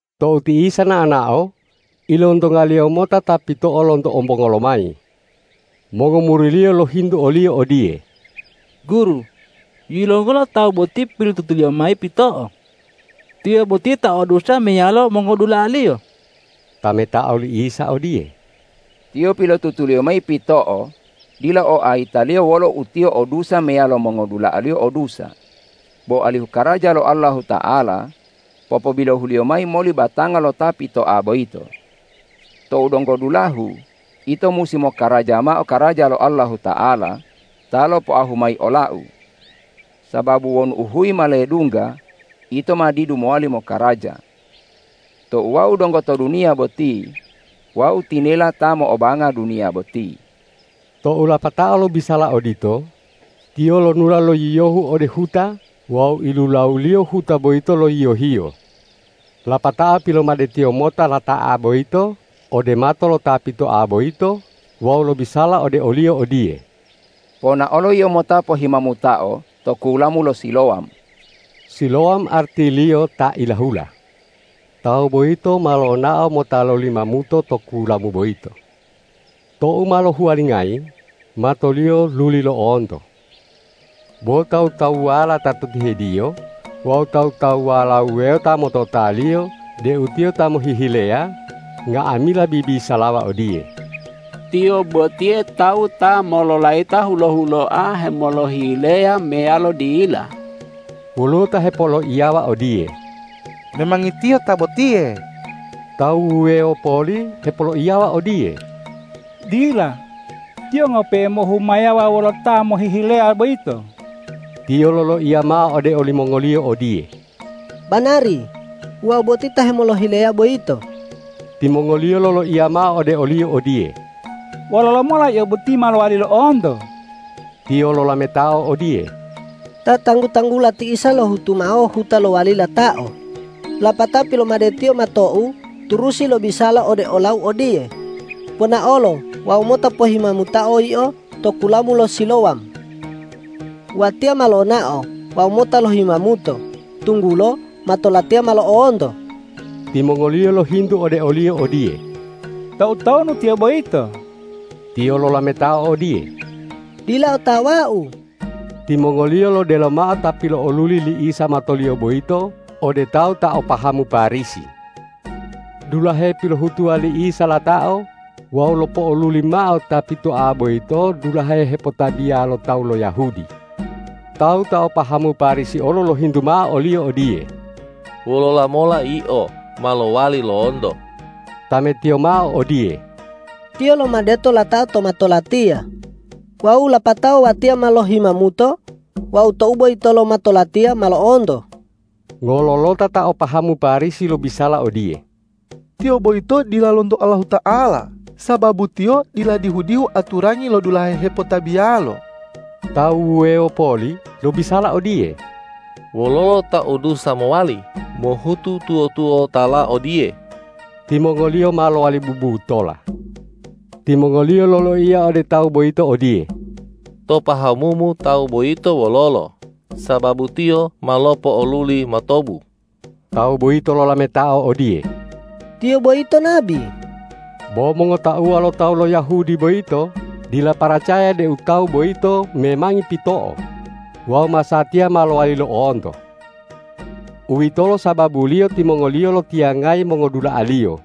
Tou ti Isa nao-nao, ilontonga-Liyo mota ta pito'o lonto ombongo lomayi. Mongomuri-Liyo lohintu o-Liyo odiye,”Guru, yilongola tawu boti pilotutuliyo mayi pito'o? Tiyo boti ta o dusa meyalo mongodula'aliyo?” Tametao li Isa odiye,”Tiyo pilotutuliyo mayi pito'o dila o ayitaliyo wolo u tiyo o dusa meyalo mongodula'aliyo o dusa, bo alihu karaja lo Allahuta'ala popobilohuliyo mayi moli batanga lo ta pitoa boyito. Tou donggo dulahu ito musi mokaraja mao karaja lo Allahuta'ala ta lopoahu mayi ola-U. Sababu wonu uhuyi ma ledungga, ito ma didu mowali mokaraja. Tou Wau donggo to duniya boti, Wau tinela ta mo'obanga duniya boti.” Tou lapatao lobisala odito, Tiyo lonula lo yiyohu ode huta wawu ilulawu-Liyo huta boyito lo yiyo-Hiyo. Lapatao pilomade-Tiyo mota lata'a boyito ode mato lo ta pitoa boyito wawu lobisala ode oliyo odiye,”Ponaolo yio mota pohimamutao to kulamu lo Silowam.” Silowam artiliyo ta ilahula. Tawu boyito ma lonao mota lohimamuto to kulamu boyito. Tou ma lohuwalingayi, matoliyo luli lo'onto. Bo tawu-tawuwala ta to tihediyo wawu tawu-tawuwala wuwewo ta mototaliyo deu tiyo ta mohihileya, nga'amila bibisalawa odiye,”Tiyo botiye tawu ta mololayita hulo-huloa hemolohileya meyalo dila?” Woluwo ta hepoloiyawa odiye,”Memangi tiyo ta botiye.” Tawu wuwewo poli hepoloiyawa odiye,”Dila, tiyo ngope'e mohumayawa wolo ta mohihileya boyito.” Tiyo loloiya mao ode olimongoliyo odiye,”Banari, Wau boti ta hemolohileya boyito.” Timongoliyo loloiya mao ode oliyo odiye,”Wololo mola yio boti ma lowali lo'onto?” Tiyo lolametao odiye,”Ta tanggu-tanggula ti Isa lohutu mao huta lowali latao, lapatao pilomade-Tiyo matou turusi lobisala ode olau odiye, ’Ponaolo wawu mota pohimamutao yio to kulamu lo Silowam.’ Watiya ma lonao wawu mota lohimamuto, tunggulo mato latiya ma lo'onto.” Timongoliyo lohintu ode oliyo odiye,”Toutonu tiyo boyito?” Tiyo lolametao odiye,”Dila otawau.” Timongoliyo lodelo mao ta pilo'oluli li Isa matoliyo boyito ode tawu ta o pahamu Parisi. Dulahe pilohutuwa li Isa latao wawu lopo'oluli mao ta pitoa boyito dulahe hepotabiya lo tawu lo Yahudi. Tawu ta o pahamu Parisi olo lohintu mao oliyo odiye,”Wololo mola yio ma lowali lo'onto?” Tametiyo mao odiye,”Tiyo lomadeto latao to mato latiya, wawu lapatao watiya ma lohimamuto wawu tou boyitolo mato latiya ma lo'onto.” Ngololota ta o pahamu Parisi lobisala odiye,”Tiyo boyito dila lonto Allahuta'ala, sababu Tiyo dila dihu-dihu aturangi lo dulahe hepotabiyalo.” Tawu wuwewo poli lobisala odiye,”Wololo ta o dusa mowali mohutu tuwo-tuwotala odiye?” Timongoliyo ma lowali bubutola. Timongoliyo loloiya ode tawu boyito odiye,”To pahamumu Tawu boyito wololo, sababu Tiyo ma lopo'oluli matomu?” Tawu boyito lolametao odiye,”Tiyo boyito Nabi.” Bo mongotauwa lo tawu lo Yahudi boyito dila paracaya deu tawu boyito memangi pito'o wawu masatiya ma lowali lo'onto. Uwitolo sababuliyo timongoliyo lotiyangayayi mongodula'aliyo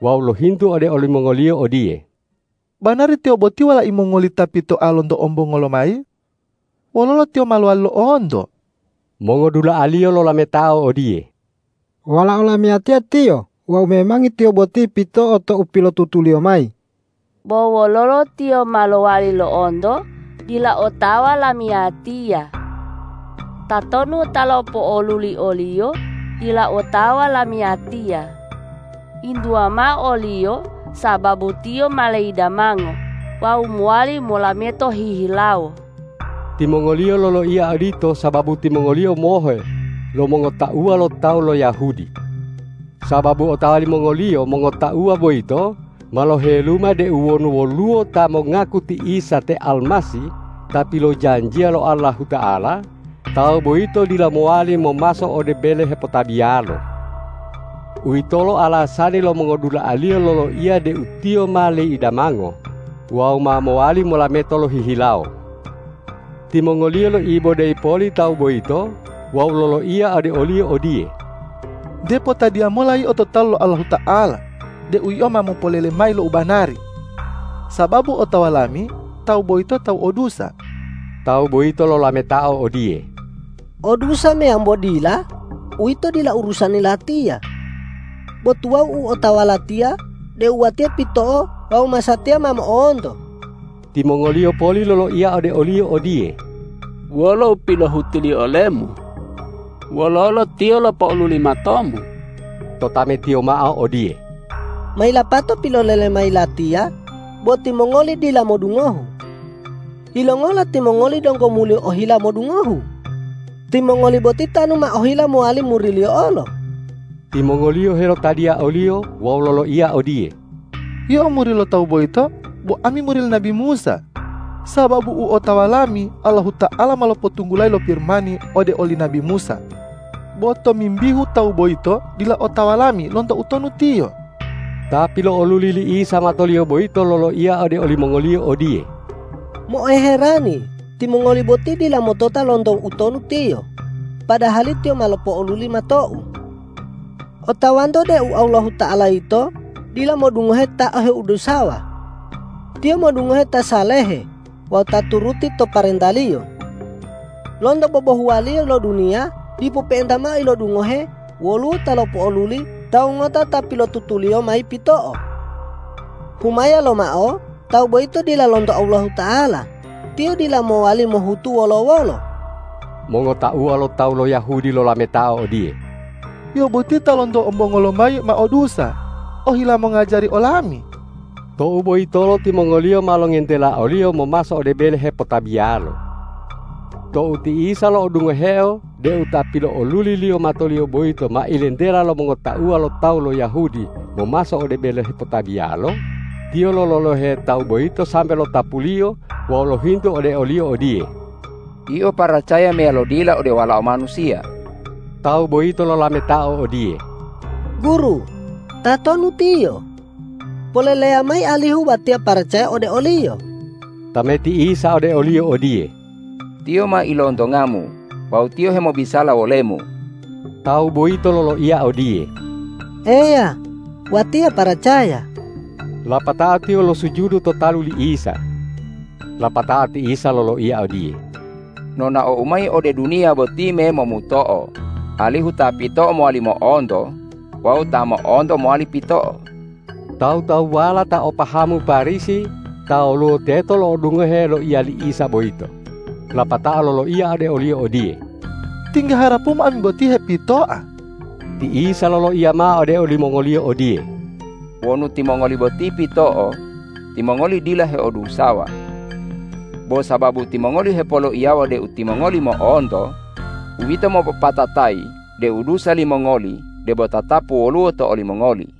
wawu lohintu ode olimongoliyo odiye,”Banari tiyo boti walai mongoli ta pitoa lonto ombongo lomayi? Wololo tiyo ma lowali lo'onto?” Mongodula'aliyo lolametao odiye,”Walao lamiyatiya tiyo wawu memangi tiyo boti pito'o tou pilotutuliyo mayi. Bo wololo tiyo ma lowali lo'onto, dila otawa lamiyatiya. Tatonu ta lopo'oluli oliyo, dila otawa lamiyatiya. Yintuwa mao oliyo sababu tiyo ma leidamango wawu mowali molameto hihilawo.” Timongoliyo loloiya odito sababu timongoliyo mohe lo mongotauwa lo tawu lo Yahudi. Sababu otawa limongoliyo mongotauwa boyito ma loheluma deu wonu woluwo ta mongaku ti Isa te Almasih ta pilojanjiya lo Allahuta'ala, tawu boyito dila mowali momaso ode bele hepotabiyalo. Uwitolo alasani lo mongodula'aliyo loloiya deu tiyo ma leidamango wawu ma mowali molameto lohihilawo. Timongoliyo loibodeyi poli tawu boyito wawu loloiya ode oliyo odiye,”Nte potadiya mola yio to talu Allahuta'ala deu yio ma mopolele mayi lo u banari. Sababu otawa lami Tawu boyito tawu o dusa.” Tawu boyito lolametao odiye,”O dusa meyambo dila, uwito dila urusani latiya, bo tuwawu u otawa latiya deu watiya pito'o wawu masatiya ma mo'onto.” Timongoliyo poli loloiya ode oliyo odiye,”Wolo u pilohutu-Liyo olemu? Wololo Tiyo lopo'oluli matomu?” Totametiyo mao odiye,”Ma yilapato pilolele mayi latiya, bo timongoli dila modungohu. Yilongola timongoli donggo muli ohila modungohu? Timongoli boti tanu ma ohila mowali muri-Liyo olo.” Timongoliyo helotadiya oliyo wawu loloiya odiye,”Yio muri lo Tawu boyito, bo ami muri li nabi Musa. Sababu u otawa lami Allahuta'ala ma lopotunggulayi lo Pirimani ode oli nabi Musa. Bo tomimbihu Tawu boyito, dila otawa lami lonto utonu Tiyo.” Ta pilo'oluli li Isa matoliyo boyito loloiya ode olimongoliyo odiye,”Mo'oherani timongoli boti dila motota lonto utonu Tiyo, padahali Tiyo ma lopo'oluli matou. Otawanto deu Allahuta'ala yito dila modungohe ta heodusawa; Tiyo modungohe ta salehe wawu ta turuti to parenta-Liyo. Lonto bobohuwaliyo lo duniya dipo pe'enta mao ilodungohe woluwo ta lopo'oluli tawu ngota ta pilotutuliyo mayi pito'o. Humaya lomao Tawu boyito dila lonto Allahuta'ala, Tiyo dila mowali mohutu wolo-wolo.” Mongotauwa lo tawu lo Yahudi lolametao odiye,”Yio boti ta lonto ombongo lomayi ma o dusa, ohila mongajari olami!” Tou boyitolo timongoliyo ma longentela oliyo momaso ode bele hepotabiyalo. Tou ti Isa lo'odungoheo deu ta pilo'oluli-Liyo matoliyo boyito ma ilentela lo mongotauwa lo tawu lo Yahudi momaso ode bele hepotabiyalo, Tiyo lololohe tawu boyito sambe lotapuLiyo wawu lohintu ode oliyo odiye,”Yio paracaya meyalo dila ode Walao Manusiya?” Tawu boyito lolametao odiye,”Guru, tatonu Tiyo? Poleleya mayi alihu watiya paracaya ode o-Liyo.” Tameti Isa ode oliyo odiye,”Tiyo ma ilontongamu wawu Tiyo hemobisala wolemu.” Tawu boyito loloiya odiye,”Eya, Watiya paracaya!” Lapatao tiyo losujudu to talu li Isa. Lapatao ti Isa loloiya odiye,”Nonao-U mayi ode duniya boti memomuto'o, alihu ta pito'o mowali mo'onto wawu ta mo'onto mowali pito'o.” Tawu-tawuwala ta o pahamu Parisi ta woluwo teto lo'odungohe loiya li Isa boyito, lapatao loloiya ode o-Liyo odiye,”Tingga harapu-Mu ami boti hepitoa?” Ti Isa loloiya mao ode olimongoliyo odiye,”Wonu timongoli boti pito'o, timongoli dila heodusawa. Bo sababu timongoli hepoloiyawa deu timongoli mo'onto, uwito mopopatatayi deu dusa limongoli debo tatapu woluwo to olimongoli.”